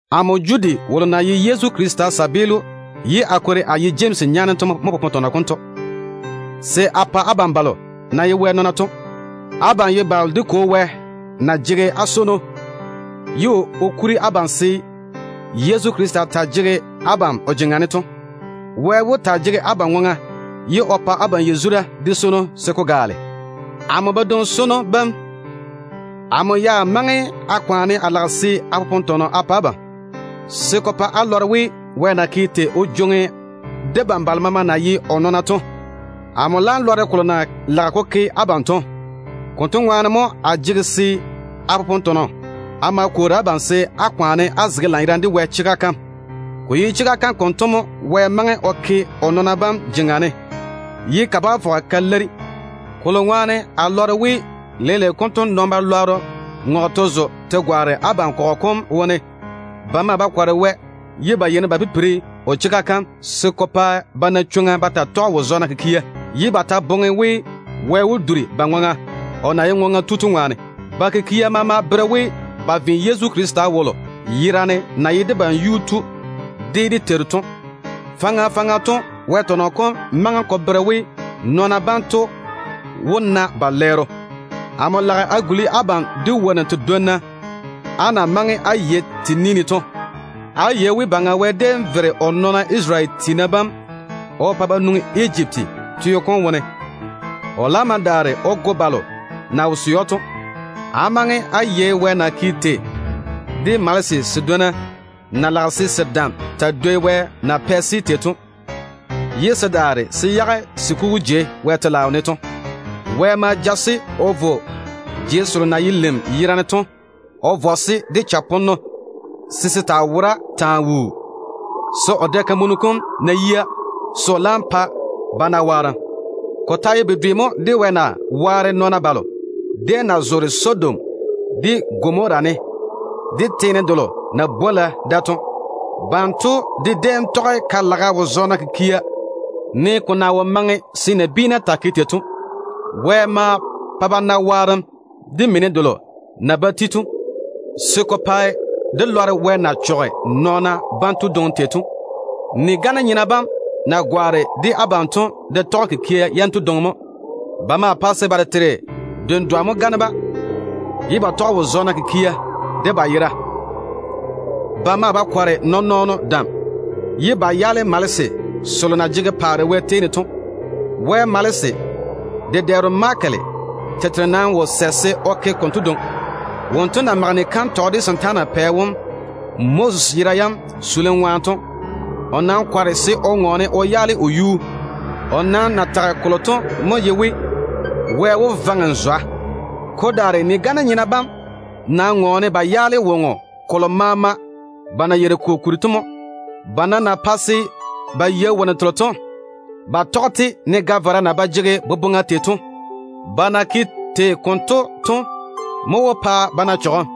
Amo Judi wolo na ye Yezu Krista kabaa ye a kwori a ye Jemsi nyaane to mo popone tɔnɔ konto se a pa abam balo Wɛ na bwoŋi se á ta‑á ye o nɔɔna to. Abam mo ye balo dé Kwo Wɛ na swoi ye Yezu Krista jege abam o jeŋa ne to. Wɛ wó taa jege abam ŋwaŋa, ye o pa abam yazura de swono se ko gaale. Amo badwoŋ-swonnu bam, amo ya maŋe a kwaane a lage se a popone tɔnɔ a pa abam, se ko pa á lɔre Wɛ na ke tei o jwoŋi debam balo maama na ye o nɔɔna to. Amo laam nam nɛ we ko ye fefeo mo se a popone tɔnɔ a ma kwoori abam se á chichei á zege Wɛ chega kam ŋwaane. Ko ye chega kam konto mo Wɛ maŋe o ke o nɔɔna bam jeŋa ne, ye ka bá fɔge ka leiri. Kokuri to, a lɔre we Wɛ-lwɛɛna mo ŋɔge ba zo ba gwaane abam kɔgɔ kom wone. Ba maa ba kɔre Wɛ ye ba yeini ba pipiri o chega kam, se ko pa ba na chwoŋa ba taa tɔge wo-digiru kikia, ye ba ta boŋe we Wɛ wó duri ba ŋwaŋa, o na ye ŋwaŋa tu to ŋwaane. Ba kikia maa bere we, ba ve Yezu Krista wolo yerane na ye debam Yuu-tu de dé Teiru to. Faŋa faŋa to Wɛ tɔnɔ kom maŋe ko bere we, nɔɔna banto dwi wó na ba lɛɛro. Amo lage a guli abam de wonnu tedwonna á na maŋe á yei te ni ne to. Á yei we dé Teiru Wɛ déem vere o nɔɔna Isarele tiina bam o pa ba nwoŋi Ejipti teo kom wone. Ko kwaga ne to, o laam ma yɔɔre o chɔge balo na wo sɛ‑o to. Á maŋe á yei Wɛ na ke tei de malese sedwonna na lage se se dam taa dwoi Wɛ ya na pɛ-se tei to, ye se daare se yage se kugu jei Wɛ telaao ne to. Wɛ ma vɔ-se de chaponno o de jei selo na ye lim yerane to wone o yage da, se se taa wora taa wuu, se o dɛ-kamunu kom ná yia, se o laam pa se na waarem. Ko ta ye bedwe mo de Wɛ na ke tei o waare nɔɔna balo déem na zoore Sodom de Gomora ne, de teene delo na bwola da to. Banto de déem tɔge bwoorim wo-zɔɔna kikia, ne ko na wo maŋe se nabiina taa ke tei to. Wɛ ma pa ba na waarem de mini delo na ba ti to, se ko taa ye maana ko pae nɔɔna maama. Vwa-nyena bam konto na gwaane abam wone to, ba de tɔge kikia yanto dwoŋi mo. Ba maa pae se ba tete dendwa mo gane-ba, ye ba tɔge wo-zɔɔna kikia de ba yera. Ba maa ba kɔre nɔɔn-nɔɔno dam, ye ba yaale malese selo na jege paare Wɛ tei ne to. Wɛ malese dedɛɛro Mikayeli tete nam wo sɛ se o ke konto dwoŋi. Wonto na mage kantɔgɔ de setaana pɛ wom Moses yera yam keim ŋwaane to, o kɔre se o ŋɔɔne o yaale o yuu. O nam na tage kolo to mo ye we, “Wɛ wó vaŋe n zwa.” Ko daare vwa-nyena bam nam ŋɔɔne ba yaale woŋo kolo maama ba na yeiri ko kuri to. Ba nam na pae se ba yei wonnu telo to, ba tɔge-te ne ga-vara na ke tei ye ba ba jege boboŋa to. Ba kikia yam konto mo wó pa ba na chɔgem.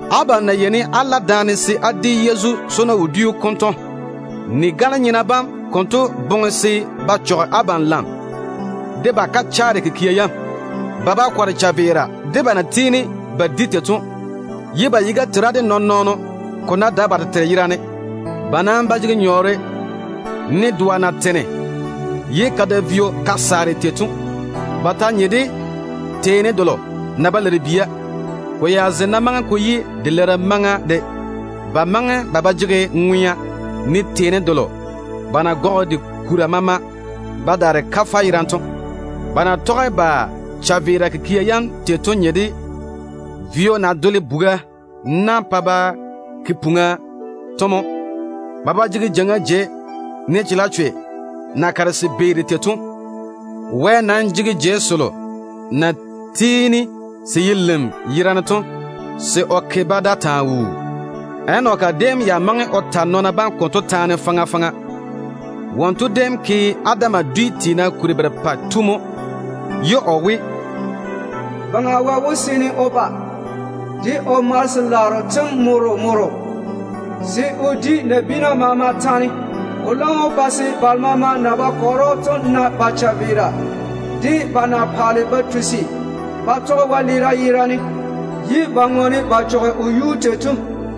Abam na yeini á la daane se á di wodiu da-swono ŋwaane to, vwa-nyena bam konto boŋe se ba chɔge abam lam de ba kachaare kikia yam. Ba ba kɔre chaveera de ba na tiini ba di tei to, ye ba yiga tera de nɔɔn-nɔɔno ko ná dae ba tete yerane. Ba nam ba jege nyɔɔre, ne doa na tene ye ka da vio ka saare to. Ba ta nye de teeni delo na ba leiri bia, ko ya ze ná maŋe ko yi de leirim maŋa mo de. Ba maŋe ba ba jege ŋwea, ne teeni delo ba na gɔge de de kura maama ba daare kafɛ yerane to mo. Ba na tɔge ba chaveera kikia yam tei to nye de vio na dole buga na, pa ba pɔgele ye ba zaŋe puŋa tei to mo. Ba ba jege jeiŋa jei, ne chalechwe na kare se beeri tei to. Wɛ nam pɔɔre jeiga kalo na tiini ka ye lim yerane to se o ke-ba da taa wuu. Enoki déem ya wuuri o ta nɔɔna bam konto taane faŋa faŋa. Wonto déem ke Adam dwi tiina kuri berepɛ tu mo, ye o we, “Nii-na! Baŋa Wɛ wó seene o ba de o malese-laaro tem morro kuni morro, se o di nabiina maama taane. O laam wó pa se Wɛ-lwɛɛna na ba chaveera, de ba na paale ba tusi ba tɔge wɛleera yerane, ye ba ŋɔɔne ba chɔge o yuu tei to.”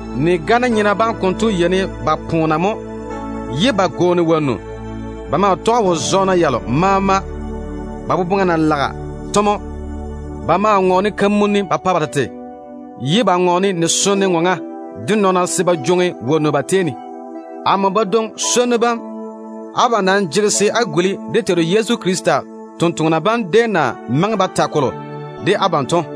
Vwa-nyena bam konto yeini ba poona mo ye ba gwooni ba dwonna. Ba maa tɔge wo-zɔɔna yalo maama ba fera na zoore to. Ba maa ŋɔɔne kamunni ba pa ba tete, ye ba ŋɔɔne ni-sone ŋɔŋa de nɔɔna se ba na nyɔɔre ba baŋa ne. Amo badwoŋ-swonnu bam, abam nam jege se á guli dé Teiru Yezu Krista totoŋa nakwa bam déem na maŋe ba ta kolo de abam to mo.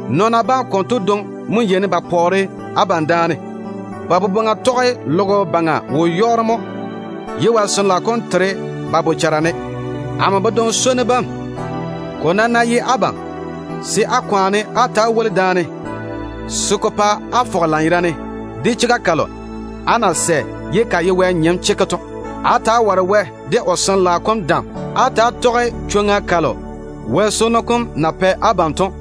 Nɔɔna bam konto dwi mo yeini ba pae abam pɔɔre daane. Ba boboŋa tɔge logo baŋa wo-yɔɔro mo ye Wɛ Sin-laao kom tere ba bochara ne. A badwoŋ-swonnu bam, ko nam ná ye abam, á kwaane á ta‑á woli daane se ko pa á bochara fɔge lanyerane de chega kalo á na sɛ de wo-dedoa ye ka ye Wɛ nyem chekke to. Á ta‑á ware Wɛ de o Sin-laao kom dam. Á ta‑á jege á ŋwea de Wɛ swono kom o na pɛ abam to,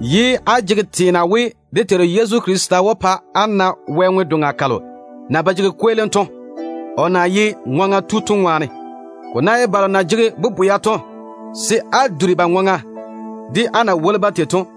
ye á jege teena we dé Teiru Yezu Krista wó ba o pa á na Wɛ ŋwe-doŋa kalo na ba jege kweelim to, o na jege abam ŋwaŋa to ŋwaane. Ko ná ye balo na jege bobwea to, se á duri ba ŋwaŋa de á na woli-ba tei to.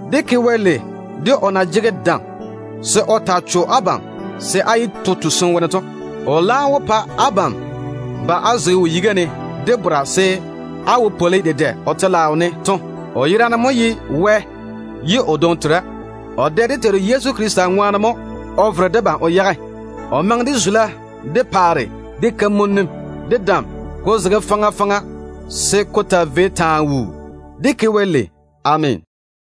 Dé ke Wɛ lei, de o na jege dam se o taa cho abam se á yé to tusim wone to. O laam wó pa abam ba á zege o yiga ne de bora, se á wane á zo o paare dem wo de wopwolo dedɛ. O yerane mo ye Wɛ ye o dwoŋi tera. O maa ye dé Vereno. Dé Teiru Yezu Krista ŋwaane mo o maŋe de zula, de paare, de yere-zɔŋɔ, de dam, ko na zege faŋa faŋa ye logo baŋa ta tera to, de zem maama de, se ko taa vei wuu. Dé ke Wɛ lei. Ameena.